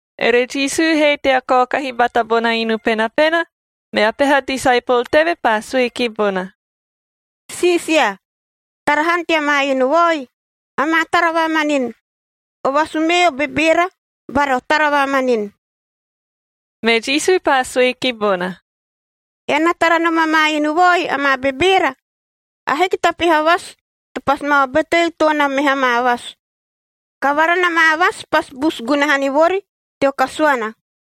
Ere Jisu he tea kaokahi bata bona inu penapena, mea peha disaepol teve paa sue ki bona, “Siisia, tara han tea maa inu vaoi,a amaa tara vamanini! O vasu mee o bebeera bara o tara vamanini!” Me Jisu paa sue ki bona, “Ean na tara nom amaa inu vaoi amaa bebeera? Ahiki ta peha vasu to pasi ma obeteu toon na meha maa vasu. Kavara na maa vasu pasi busu gunaha ni vori teo kasuana.”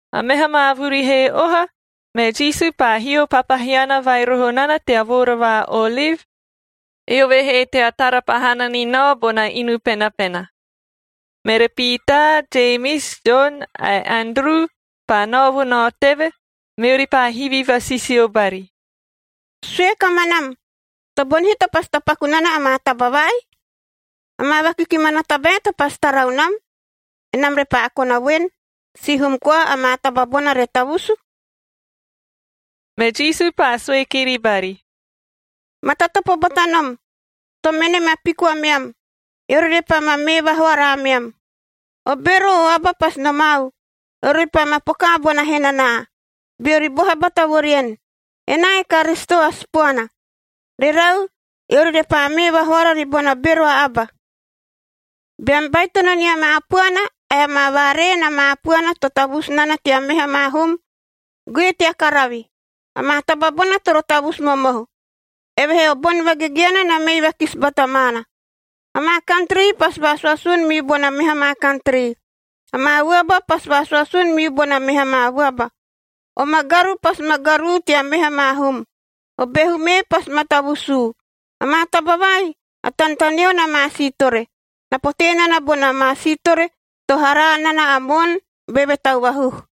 A meha maa vuri he oha, me Jisu paa hio papahiana vai roho nana tea Voora va Oliv, eove he tea tara pahana ni nao bona inu penapena. Mere Piitaa, Jemis, Jon ae Anduru paa nao vo nao teve, meori paa hivi vasisio bari, “Sue kamanam, tobonihi to pasi tapaku nana amaa taba vai? Amaa vakikimana tabae to pasi tarau nam, enam repaa kona voen, sihum koa amaa taba bona re tavusu?” Me Jisu paa sue kiri bari, “Matatopo bata nom, to mene ma piku ameam, eori repaa ma mee vahoara ameam. O bero o aba pasi nomau, eori repaa ma pokaa bona henanaa, beori boha bata vo rien, ‘Enaa e Karisito a Sipoana.’ Rerau, eori repaa mee vahoara ribona bero a aba. Beam baitono nia maa puana ae amaa vaaree na maa puana to tavusu nana tea meha maa hum, goe tea karavi. Amaa taba bona toro tavusu momohu, evehee o boni vagegeana na mei vakisi bata maana. Amaa kantri pasi vaasuasun miu bona meha maa kantri. Amaa vuaba pasi vaasuasun miu bona meha maa vuaba. O magaru pasi ma garuu tea meha maa hum. O behu mee pasi ma tavusuu. Amaa taba vai a tanetaneo na maa siitore. Na potee nana bona maa siitore to haraa nana a moon beve tau vahuhu.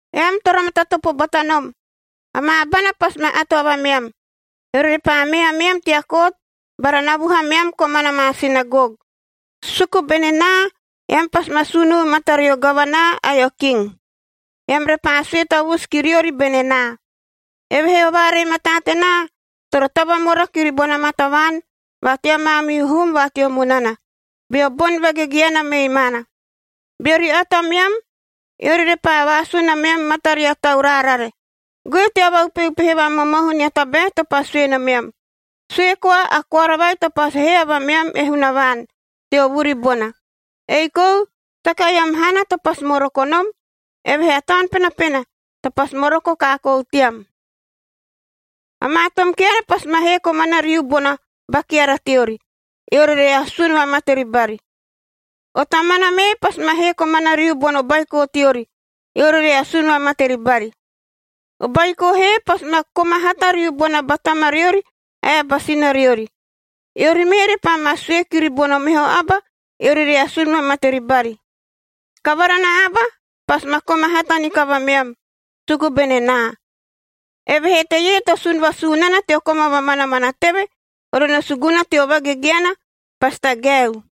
“Eam toro matatopo bata nom! Amaa abana pasi ma ato avameam, eori repaa mee ameam tea kot bara navuhu ameam komana maa sinagog. Suku bene naa, eam pasi ma sunuu matario gavanaa ae o king, eam repaa sue tavusu ki riori bene naa. Evehee o vaaree mataa tenaa toro tavamora kiri bona maa tavaan va tea maamihu hum va teo munana, beo boni vagegeana mei maana. Beori ato ameam, eori repaa vaasun ameam mataria tau raarare, goe tea vaupeupehe vamomohu nia tabae to pasi sue nomeam. Sue koa a koara vai to pasi hee avameam e Hunavaan teo vuri bona. Ei kou saka eam haana to pasi moroko nom, evehee a Taun Penapena to pasi moroko kaakoou team. “Amaa tom keara pasi ma hee komana riu bona ba keara teori, eori re asun vamate ribari. O tamana mee pasi ma hee komana riu bono baiko teori, eori re asun vamate ribari. O baiko he pasi ma koma hata riu bona ba tamariori ae a ba sinariori. Eori mee repaa ma sue kiri bono meho aba, eori re asun vamate ribari. Kavara na aba pasi ma koma hata ni kavameam, suku bene naa. Evehee teie to sun vasuu nana teo koma vamanamana teve, ore no suguna teo vagegeana, pasi tagaeu.”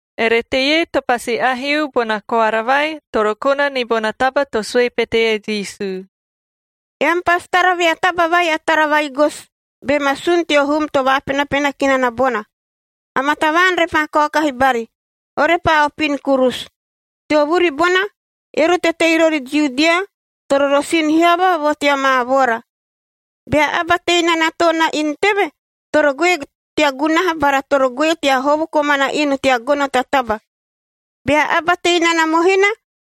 Ere teie to pasi aheu bona koara vai, toro kona ni bona taba to sue pete e Jisu: “Eam pasi tara vea taba vai a tara va-igosi be ma sun teo hum to vaapenapena ki nana bona. Amaa tavaan repaa kaokahi bari, orepaa opin kurusu.b Teo vuri bona eori to tei rori Judia toro rosin hiava vo tea maa voora. Bea aba tei nana toon na inu teve, toro goe tea gunaha bara toro goe tea hovo komana inu tea gono ta taba. Bea aba tei nana mohina,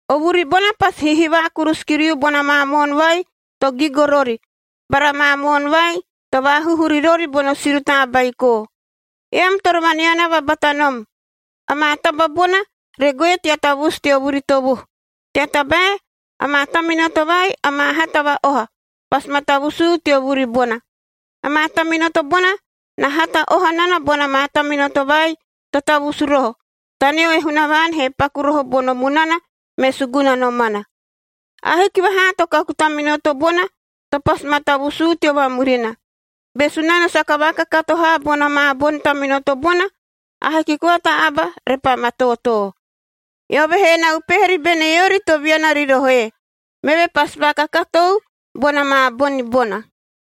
O vuri bona pasi hihivaa kurusu kiriu bona maa moon vai to gigo rori bara maa moon vai to vaahuhu ri rori bono si rutaa baiko. Eam toro vaneanava bata nom, amaa taba bona re goe tea tavusu teo vuri tovuhu, tea tabae amaa taminoto vai amaa hata va-oha, pasi ma tavusuu teo vuri bona. Amaa taminoto bona na hata oha nana bona maa taminoto vai to tavusu roho, taneo e Hunavaan he paku roho bono munana me suguna nomana. Ahiki vahaa to kaku taminoto bona to pasi ma tavusuu teo vamurina. Be Sunano saka vaakakato haa bona maa boni taminoto bona, ahiki koa ta aba repaa ma tootoo. Eove he na upehe ribene eori to viana ri rohoe, meve pasi vaakakatou bona maa boni bona.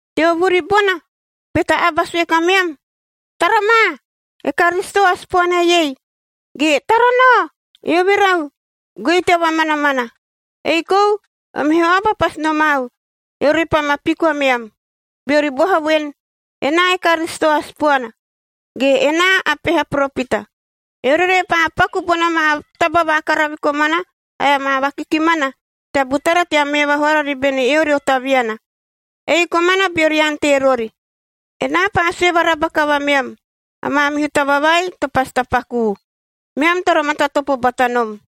“Teo vuri bona, be ta aba sue kameam, ‘Tara ma, e Karisito a Sipoana eiei!’ ge ‘Tara nao, eove rau!’ goei tea vamanamana. Ei kou o meho aba pasi nomau, eori repaa ma piku ameam, beori boha voen, ‘Enaa e Karisito a Sipoana’ ge ‘Enaa a peha poropita.’ Eori repaa paku bona maa taba vakaravi komana ae amaa vakikimana tea butara tea mee vahoara ribene eori o taviana, ei komana beori ante rori. Enaa paa sue varaba kavameam, a maamihu taba vai to pasi tapakuu. Meam toro matatopo bata nom!”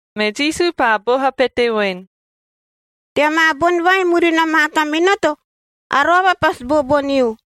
Me Jisu paa boha pete voen, “Tea maa boni vai murina maa taminoto, A roava pasi booboniu.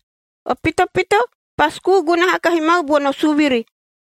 O pitopito pasi kuu gunaha kahi mau bono suviri,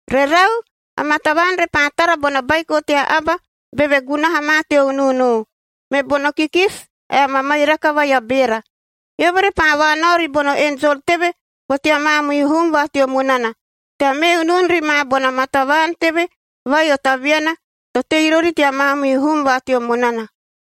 “Rerau, amaa tavaan repaa tara bona ‘Baiko tea Aba beve gunaha ma teo unuunu’g me bono kikisi ae a mamairaka vai a beera. Eove repaa vaanao ribono enjol teve vo tea maamihu hum va teo munana tea mee unun ri ma bona maa tavaan teve vai o taviana to tei rori tea maamihu hum va teo munana.”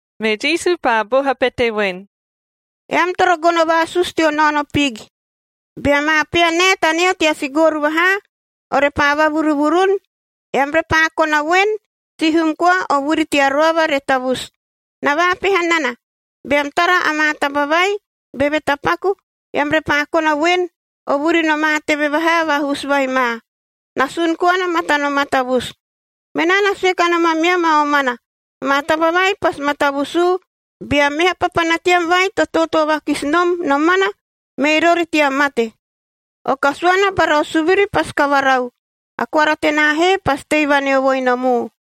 Me Jisu paa boha pete voen, “Eam toro gono vaasusu teo naono piig. Bea maa pea nae taneo tea sigooru vahaa, orepaa vavuruvurun,h eam repaa kona voen, sihum koa o vuri tea roava re tavusu. Na vaapeha nana, beam tara amaa taba vaii beve tapaku, eam repaa kona voen, o vuri nomaa teve vahaa vahusu vai ma. Na sun koana matano matavusu. Menaa na sue kanom ameam a omana, amaa taba vai pasi ma tavusuu bea meha papana team vai to tootoo vakisi nom nomana, mei rori tea mate. O kasuana bara o suviri pasi kavarau, a koara tenaa he pasi tei vaneovoi nomu.”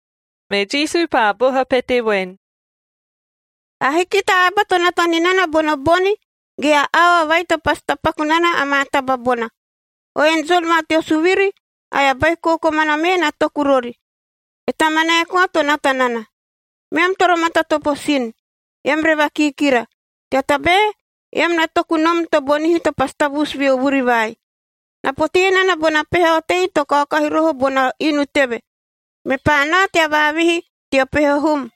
Me Jisu paa boha pete voen, “Ahiki ta aba to nata ni nana bono boni ge a aoa vai to pasi tapaku nana amaa taba bona. O enjol va teo suviri ae a Baiko komana mee na toku rori, e Tamanae koa to nata nana. Meam toro matatopo sin, eam re vakiikira, tea tabae eam na toku nom tobonihi to pasi tavusu veo vuri vai. Na potee nana bona peha otei to kaokahi roho bona inu teve, mepaa nao tea vaavihi teo peho hum.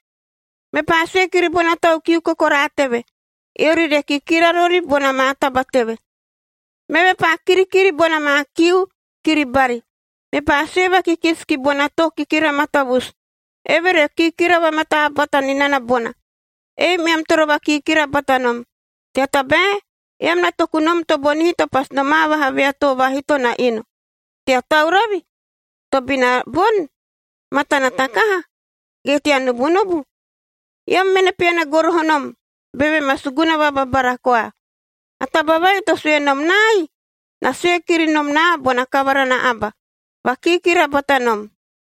Mepaa sue kiri bona tau kiu kokoraa teve, eori re kikira rori bona maa taba teve. Meve paa kirikiri bona maa kiu kiri bari. Mepaa sue vakikisi ki bona too kikira matavusu, eve re kikira vamataa bata ni nana bona. Ei meam toro vakiikira bata nom! Tea tabae, eam na toku nom tobonihi to pasi nomaa vaha vea too vaahito na inu – tea tauravi, tobina boni, matana takaha ge tea nubunubu. Eam mene peana goroho nom beve ma suguna vababara koa. A taba vai to sue nom naai, na sue kiri nom naa bona kavara na aba: Vakiikira bata nom!”